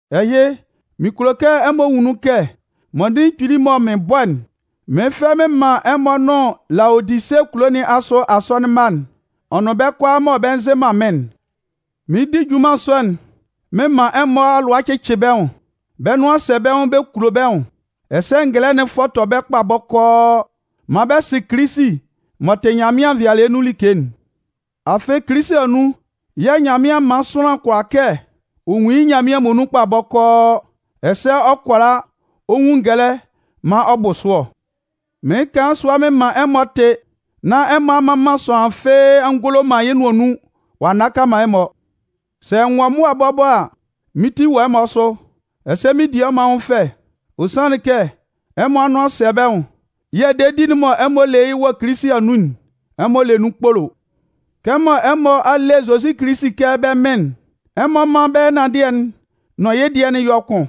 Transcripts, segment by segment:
Ɛhɩ, mɩn kulo kɛ ɛmɔ nwun nun kɛ mɔndɩnlɩn kpili'n mɔ mɩɩn bɔ'n, mɩɩn fɛ mɩn man ɛmɔ nʋn Laodise kulo nɩn asʋ asɔnɩn mma'n ɔ nʋn bɛ́ kʋalaa mɔ bɛ nzɩ man mɩ́n'n. Mɩɩn di junman sɔ'n mɩn man ɛmɔ alʋa cɩcɩ bɛ́ nwʋn, bɛ́ nʋan sɛ bɛ́ nwʋn bɛ kulo bɛ́ nwʋn, ɛsɛ ngɛlɛ'n fɔtɔ bɛ́ kpa bɔkɔɔ maan bɛ sɩ Kilisi m'ɔ tɩ Nyanmɩan nvɩalɩɛ nun like'n. Afɩ Kilisi anun yɛ̂ Nyanmɩan man sʋanlan kʋala kɛ ɔ nwun yɩ́ Nyanmɩan muonun kpa bɔkɔɔ, ɛsɛ ɔ kʋala ɔ nwun ngɛlɛ maan ɔ bʋ sʋ ɔ. Mɩɩn kan yɩ́ sʋa mɩn man ɛmɔ tɩ, nán ɛmɔ a mman man sʋanlan fɩ́ɩ́ a ngolo man yɩ́ nʋan nun ɔ'a nnaka man ɛmɔ. Sɛ n wɔ mʋa bɔbɔ a, mɩ́n ti wɔ ɛmɔ asʋ, ɛsɛ mɩn di ɛmɔ anwʋn fɛ. Ɔ sanlɩn kɛ ɛmɔ anʋan sɛ bɛ́ nwʋn yɛ̂ dedi'n mɔ ɛmɔ le yɩ́ wɔ Kilisi anun'n, ɛmɔ le nun kpolo. Kɛmɔ ɛmɔ a le Kilisi Zozi kɛ bɛ́ Mɩn'n, ɛmɔ mán bɛ ɛnanndɩɛ'n nʋn yɩ́ dɩɛ'n yɔ́ kʋn.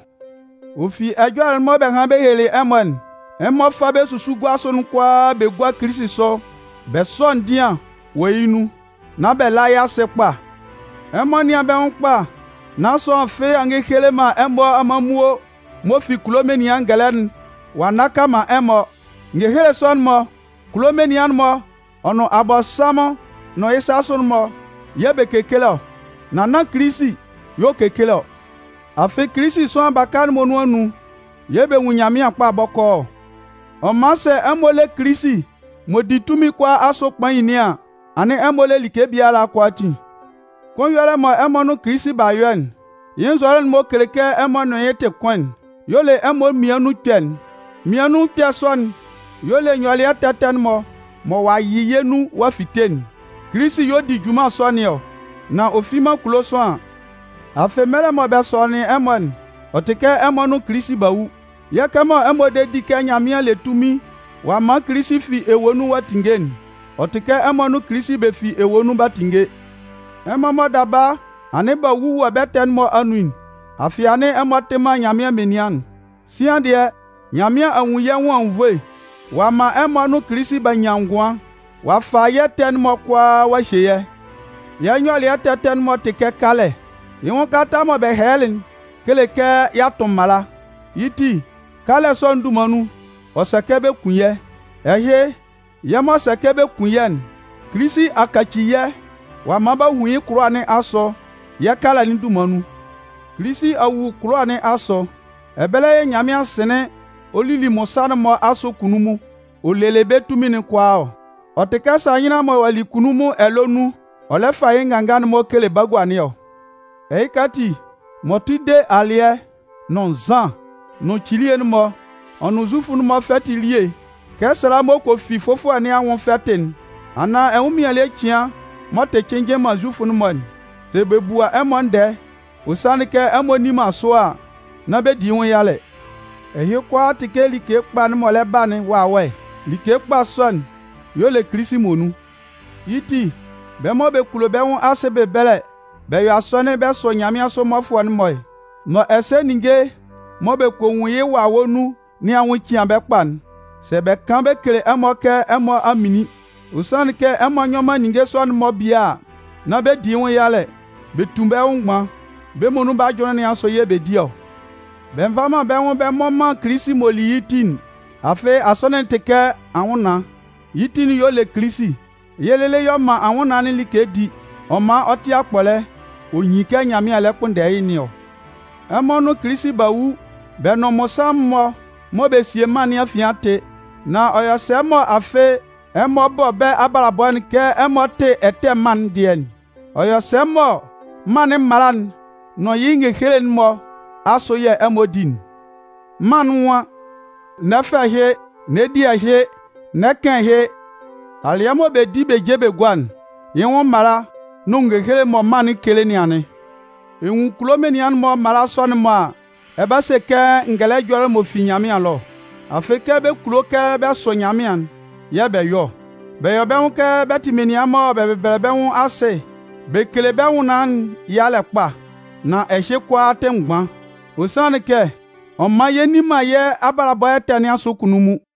Ɔ fi ɛjɔlɛ'n mɔ bɛ hanlɩn bɛ helelɩ ɛmɔ'n, ɛmɔ fá bɛ́ susuguasʋ'n kʋalaa bɛ gúa Kilisi sʋ bɛ sɔ́ ndɩan wɔ yɩ́ nun, nán bɛ lá yɩ́ asɩ kpa. Ɛmɔ nɩ́an bɛ́ nwʋn kpa, nán sʋanlan fɩ́ɩ́ a ngekele man ɛmɔ amanmuo m'ɔ fi kulo menian ngɛlɛ'n ɔ'a nnaka man ɛmɔ. Ngehele sɔ'n-mɔ, kulo menian'n-mɔ ɔ nʋn Abɔnsanmʋn nʋn yɩ́ sasʋ'n-mɔ yɛ̂ bɛ kekele ɔ, nan nán Kilisi y'ɔ kekele ɔ. Afɩ Kilisi sʋanlan baka'n muonun anun yɛ̂ bɛ nwun Nyanmɩan kpa bɔkɔɔ ɔ. Ɔ man sɛ ɛmɔ le Kilisi m'ɔ di tunmin kʋalaa asʋ kpain nɩn an, anɩn ɛmɔ le like biala kʋalaatin. Kʋn ɛyɔlɛ'n mɔ ɛmɔ nʋn Kilisi b'a yɔ'n, yɩ́ nzɔlɛ'n m'ɔ kele kɛ ɛmɔ nʋn yɩ́ tɩ kʋn'n, y'ɔ le ɛmɔ mmian nun ɛkpɛ'n. Mmian nun ɛkpɛ sɔ'n y'ɔ le nyɔlɩɛ ɛtɛ ɛtɛ'n-mɔ mɔ ɔ'a yɩ yɛ́ nun ɔ'a fite'n. Kilisi y'ɔ di junman sɔ nɩn ɔ, nán ɔ fi man kulo sʋanlan. Afɩ mɛlɛ mɔ bɛ sɔnɩnlɩn ɛmɔ'n, ɔ tɩ kɛ ɛmɔ nʋn Kilisi b'a wu. Yɛ̂ kɛmɔ ɛmɔ de di kɛ Nyanmɩan le tunmin ɔ'a man Kilisi fi ewue nun ɔ'a tinnge'n, ɔ tɩ kɛ ɛmɔ nʋn Kilisi bɛ fi ewue nun b'a tinnge. Ɛmɔ mɔ daba anɩn b'a wu wɔ bɛ́ ɛtɛ'n-mɔ anun'n, afɩ anɩn ɛmɔ tɩ man Nyanmɩan menian'n, sian dɩɛ, Nyanmɩan a nwun yɛ́ nwʋn anwunnvoe, ɔ'a man ɛmɔ nʋn Kilisi b'a nyan ngʋan. Ɔ'a fa yɛ́ ɛtɛ'n-mɔ kʋalaa ɔ'a hye yɛ́. Yɛ́ nyɔlɩɛ ɛtɛ ɛtɛ'n-mɔ tɩ kɛ kalɛ. Yɩ́ nwʋn kalata mɔ bɛ hɛlɛlɩ'n kele kɛ y'a tʋn mala. Yɩ́ ti, kalɛ sɔ'n dunman nun, ɔ sɛ kɛ bɛ kun yɛ́. Ɛhɩ, yɛ́ m'ɔ sɛ kɛ bɛ kun yɛ́'n, Kilisi a kaci yɛ́ ɔ'a man b'a hun yɩ́ kʋlʋwa nɩn asʋ yɛ́ kalɛ'n dunman nun. Kilisi a wu kʋlʋwa nɩn asʋ. Ɛbɛlɛ yɛ̂ Nyanmɩan sɩnlɩn ɔ lili mmɔnsanmʋn'n-mɔ asʋ kunnunmun ɔ lelɩ bɛ́ tunmin'n kʋalaa ɔ. Ɔ tɩ kɛ sahɩnlan mɔ ɔ'a li kunnunmun ɛlɔɛ nun ɔ lɛ fa yɩ́ nganga'n-mɔ kele bagua nɩn ɔ. Ɛhɩka ati, m'ɔ tʋ de alɩɛ, nʋn nzan, nʋn cilie'n-mɔ, ɔ nʋn Zufʋ'n-mɔ fɛtɩ elie kɛ sala m'ɔ kɔ fi fʋfɔlɛ nɩn anwʋn fɛtɩ'n anaan ɛnwʋnmɩan ele cɩan m'ɔ tɩ cɩnnjɩn man Zufʋ'n-mɔ'n, sɛ bɛ bua ɛmɔ ndɛɛ, ɔ sanlɩn kɛ ɛmɔ nni man sʋ a, nán bɛ di yɩ́ nwʋn yalɛ. Ɛhɩ kʋalaa tɩ kɛ like kpa'n m'ɔ lɛ ba'n wawɛ. Like kpa sɔ'n y'ɔ le Kilisi muonun. Yɩ́ ti, bɛ́ mɔ bɛ kulo bɛ́ nwʋn asɩ bɛbɛlɛ bɛ yɔ asɔnɩn bɛ sʋ nyanmɩansʋ mmɔfʋɛ'n-mɔ, mɔ ɛsɛ ninnge mɔ bɛ kɔ nwun yɩ́ wawɛ nun nɩn anwʋn cɩan bɛ́ kpa'n, sɛ bɛ kan bɛ kele ɛmɔ kɛ ɛmɔ a minlin, ɔ sanlɩn kɛ ɛmɔ nyɔ man ninnge sɔ'n-mɔ bie a, nán bɛ di yɩ́ nwʋn yalɛ. Bɛ tu bɛ́ nwʋn mgban, bɛ́ muonun bɛ́ ajʋnlɩn nɩn asʋ yɛ̂ bɛ di ɔ. Bɛ nva man bɛ́ nwʋn bɛ mmɔ man Kilisi m'ɔ li yɛ́ ti'n. Afɩ Asɔnɩn'n tɩ kɛ anwʋnnaan, yɩ́ ti'n y'ɔ le Kilisi. Yɩ́ lɩlɩ y'ɔ man anwʋnnaan'n like di, ɔ man ɔ tɩ akpɔlɛ ɔ nyin kɛ Nyanmɩan lɛ kpʋnndɛ yɩ́ nɩn ɔ. Ɛmɔ nʋn Kilisi b'a wu, bɛ nʋn mmɔnsanmʋn'n-mɔ mɔ bɛ sie mân nɩn afian a tɩ. Nan ɔ yɔ sɛ mɔ afɩ ɛmɔ bɔ bɛ́ abalabɔ'n kɛ ɛmɔ tɩ ɛtɛ mân'n dɩɛ'n? Ɔ yɔ sɛ mɔ mân'n mala'n nʋn yɩ́ ngehele'n-mɔ asʋ yɛ̂ ɛmɔ di'n? Mân'n nwan: “N'ɛ fa ɛhɩ!”, “N'ɛ di ɛhɩ!”, “N'ɛ kan ɛhɩ!”. Alɩɛ mɔ bɛ di bɛ je bɛ gua'n, yɩ́ nwʋn mala nʋn ngehele mɔ mân'n kele nɩn anɩn. Ɛ nwun kulo menian'n-mɔ mala sɔ'n-mɔ a, ɛ 'ba se kɛ ngɛlɛ ɛjɔlɛ m'ɔ fi Nyanmɩan ɛlɔ ɔ. Afɩ kɛ bɛ kulo kɛ bɛ sʋ Nyanmɩan'n yɛ̂ bɛ yɔ ɔ. Bɛ yɔ bɛ́ nwʋn kɛ bɛ tɩ menian mɔ bɛ bɛbɛlɛ bɛ́ nwʋn asɩ bɛ kele bɛ́ nwʋnnaan'n yalɛ kpa. Nan ɛhɩ kʋalaa tɩ mgban. Ɔ sanlɩn kɛ ɔ man yɛ nni man yɛ́ abalabɔ ɛtɛ nɩn asʋ kunnunmun.